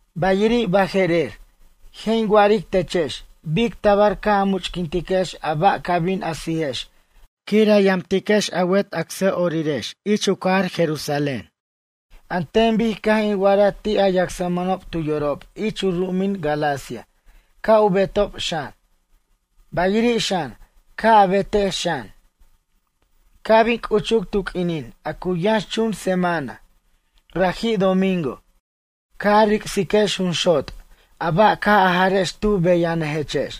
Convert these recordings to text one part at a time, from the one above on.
Bayiri' baje'rer, je' in wa'aric techex bic tabar ca' a much'quintex a ba' ca bin a sijex quir a yamtiquex a wet acsa'orirex ich u cajar Jerusalén, an ten bic caj in wa'araj ti' a yacsmʌnob tu yorob ich u ru'umin Galacia ca' u betob xan, bayiri' xan, ca' a betex xan. Ca' bin c'uchuc tu q'uinin a cu yʌnxchun semana, raji' domingo, ca' a ric'siquex junxot' a ba' caj a jarex tu beyanʌjechex.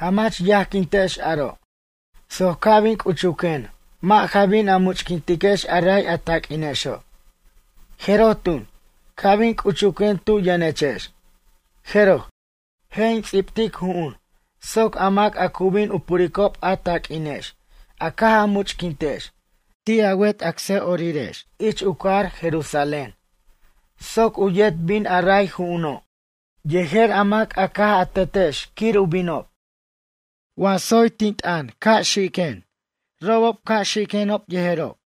Jamach yajquintex aro', soc ca' bin c'uchuquen mʌ' ja bin a much'quintex a ray a taq'uinexo'. Jeroj tun, ca' bin c'uchuquen tu yʌnechex, jeroj, je' in ts'ibtic ju'un soc a mac a cu bin u puricob a taq'uinex a caj a much'quintex ti' a wet acsa'orirex ich u cajar Jerusalén, soc u yet bin a ray ju'uno', yejer a mac a caj a tetex quir u binob. Wa tsoy tin t'ʌn ca' xiquen robob ca' xiquenob yejerob.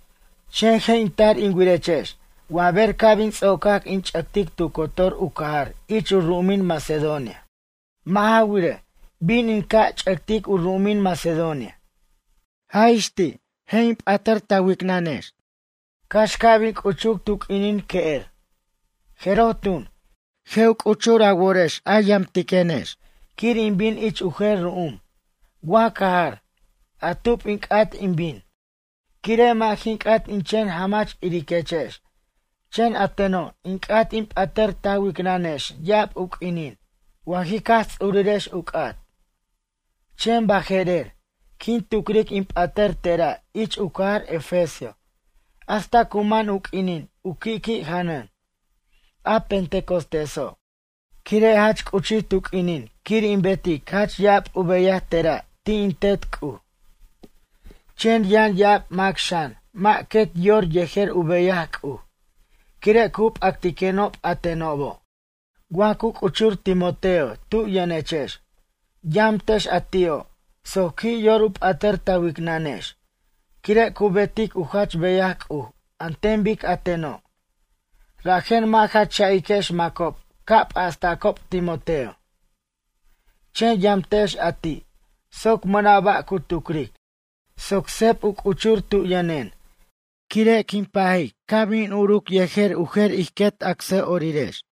Chen je' in tar in wirechex wa ber ca' bin ts'ocac in ch'ʌctic tu cotor u cajar ich u ru'umin Macedonia. Mʌ' ja wirej, bin in ca' ch'ʌctic u ru'umin Macedonia. Jaj ix ti' in p'atʌr ta wicnʌnex, cax ca' bin c'uchuc tu q'uinin que'er. Jeroj tun, je' u c'uchur a worex a yamtiquenex quir in bin ich u jer ru'um, wa cajar, a tub in c'at in bin. Quire' mʌ' jin c'at in chen jamach iriquechex, chen a teno' in c'at in p'atʌr ta wicnʌnex ya'ab u q'uinin wa jic Jaj Ts'urirex u c'at. Chen baje'rer, quin tucric in p'atʌr tera' ich u cajar Efesio hasta cu man u q'uinin u qui'qui' janʌn, a Pentecostéso'. Quire' jach c'uchij tu q'uinin quir in betic jach ya'ab u beyaj tera' ti' in Tet C'uj. Chen yʌn ya'ab mac xan mʌ' quet yor yejer u beyaj C'uj, quire' cu p'acticenob a tenobo'. Wa cu c'uchur Timoteo tu yʌnechex, yamtex a ti'o' soc qui' yor u p'atʌr ta wicnʌnex, quire' cu betic u jach beyaj C'uj an ten bic a teno'. Rajen mʌ' ja cha'iquex macob ca' p'astacob Timoteo. Chen yamtex a ti', soc mʌna' ba' cu tucric, soc seb u c'uchur tu yʌnen, quire' quin pajic ca' bin uruc yejer u jer ij quet acsa'orirex.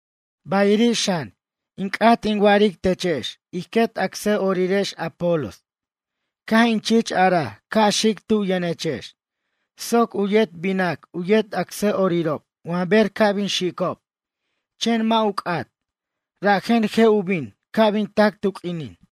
Bayiri' xan, in c'at in wa'aric techex ij quet acsa'orirex Apolos. Caj in chich araj ca' xic tu yʌnechex, soc u yet binac u yet acsa'orirob wa ber ca' bin xicob, chen mʌ' ju c'at. Rajen, je' u bin, ca' bin tac tu q'uinin.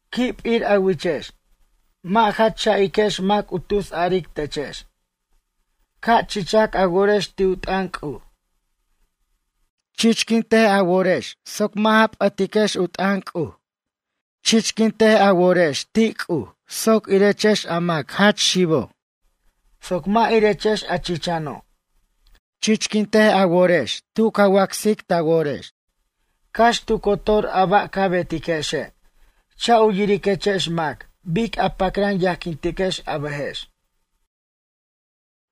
Qui' p'ir a wichex, mʌ' ja cha'iquex mac u tusaric techex. Ca' chichac a worex ti' u t'ʌn C'uj. Chichquint a worex soc mʌ' ja p'ʌtiquex u t'ʌn C'uj. Chichquin ta worex ti' C'uj soc irechex a mac jach xibo', soc mʌ' irechex a chichano'. Chichquint a worex tu ca wacsic ta worex. Cax tu cotor a ba' ca betiquexe', cha' u yiriquechex mac bic a pacran yajquintiquex a bʌjex.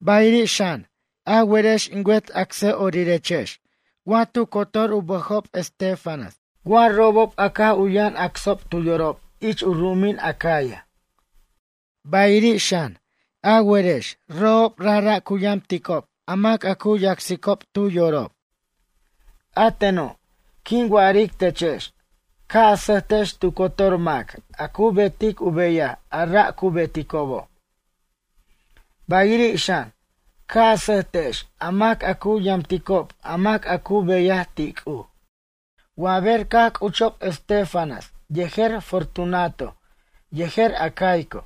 Bayiri' xan, a werex in wet acsa'orirex, wa tu cotor u bʌjob Estéfanas, wa robob a caj u yʌn acsob tu yorob ich u ru'umin Acaya. Bayiri' xan, a werex robob rajra' cu yamticob a mac a cu yacsicob tu yorob. A teno', quin wa'aric techex, ca' a sʌjtex tu cotor mac a cu betic u beyaj a ra' cu beticobo'. Bayiri' xan, ca' a sʌjtex a mac a cu yamticob a mac a cu beyaj ti' C'uj. Wa ber caj c'uchob Estéfanas yejer Fortunato yejer Acaico,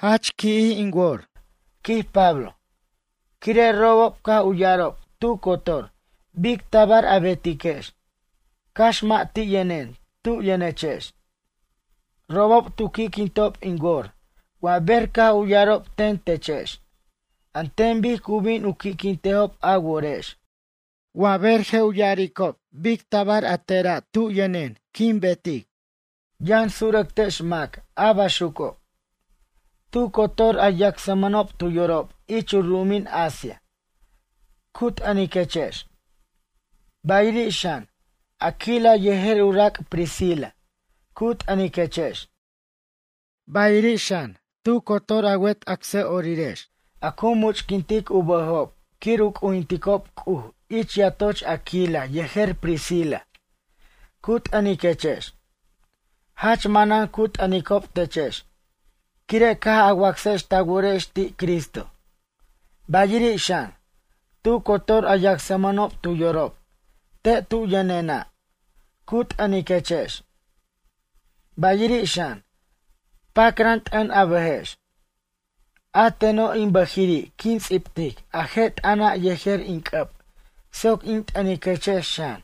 jach qui'jij in wor, quij Pablo, quire' robob caj u ya'arob tu cotor bic tabar a betiquex, cax mʌ' ti' yʌnen tu yʌnechex. Robob tu qui'quintob in wor wa ber caj u ya'arob ten techex, an ten bic cu bin u qui'quintejob a worex wa ber je' u ya'aricob bic tabar a tena' tu yʌnen quin betic. Yʌn surʌc tex mac a baxuco'. Tu cotor a yacsmʌnob tu yorob ich u ru'umin Asia, cu t'ʌniquechex. Bayiri' xan, Aquila yejer u rac' Priscila, cu t'ʌniquechex. Bayiri' xan, tu cotor a wet acsa'orirex a cu much'quint u bʌjob quir u c'ujinticob C'uj ich yatoch Aquila yejer Priscila, cu t'ʌniquechex. Jach manan cu t'ʌnicob techex quire' caj a wacsex ta worex ti' Cristo. Bayiri' xan, tu cotor a yacsmʌnob tu yorob te' tu yʌnena', cu t'ʌniquechex. Bayiri' xan, pacran t'ʌn a bʌjex. A teno' in bʌjiri' quin ts'ibtic a je' t'ʌna' yejer in c'ʌb soc in t'ʌniquechex xan.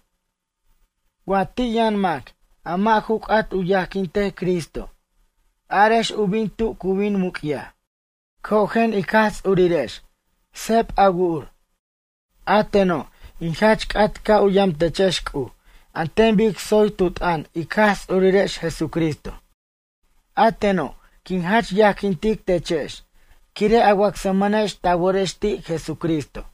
Wa ti' yʌn mac a mʌ' ju c'at u yajquintej Cristo, arex u bin tu cu bin muc'yaj. Cojen ic Jaj Ts'urirex, seb a wu'ur. A teno', in jach c'at ca' u yam techex C'uj an ten bic tsoy tu t'ʌn ic Jaj Ts'urirex Jesucristo. A teno', quin jach yajquintic techex quire' a wacsmʌnex ta worex ti' Jesucristo.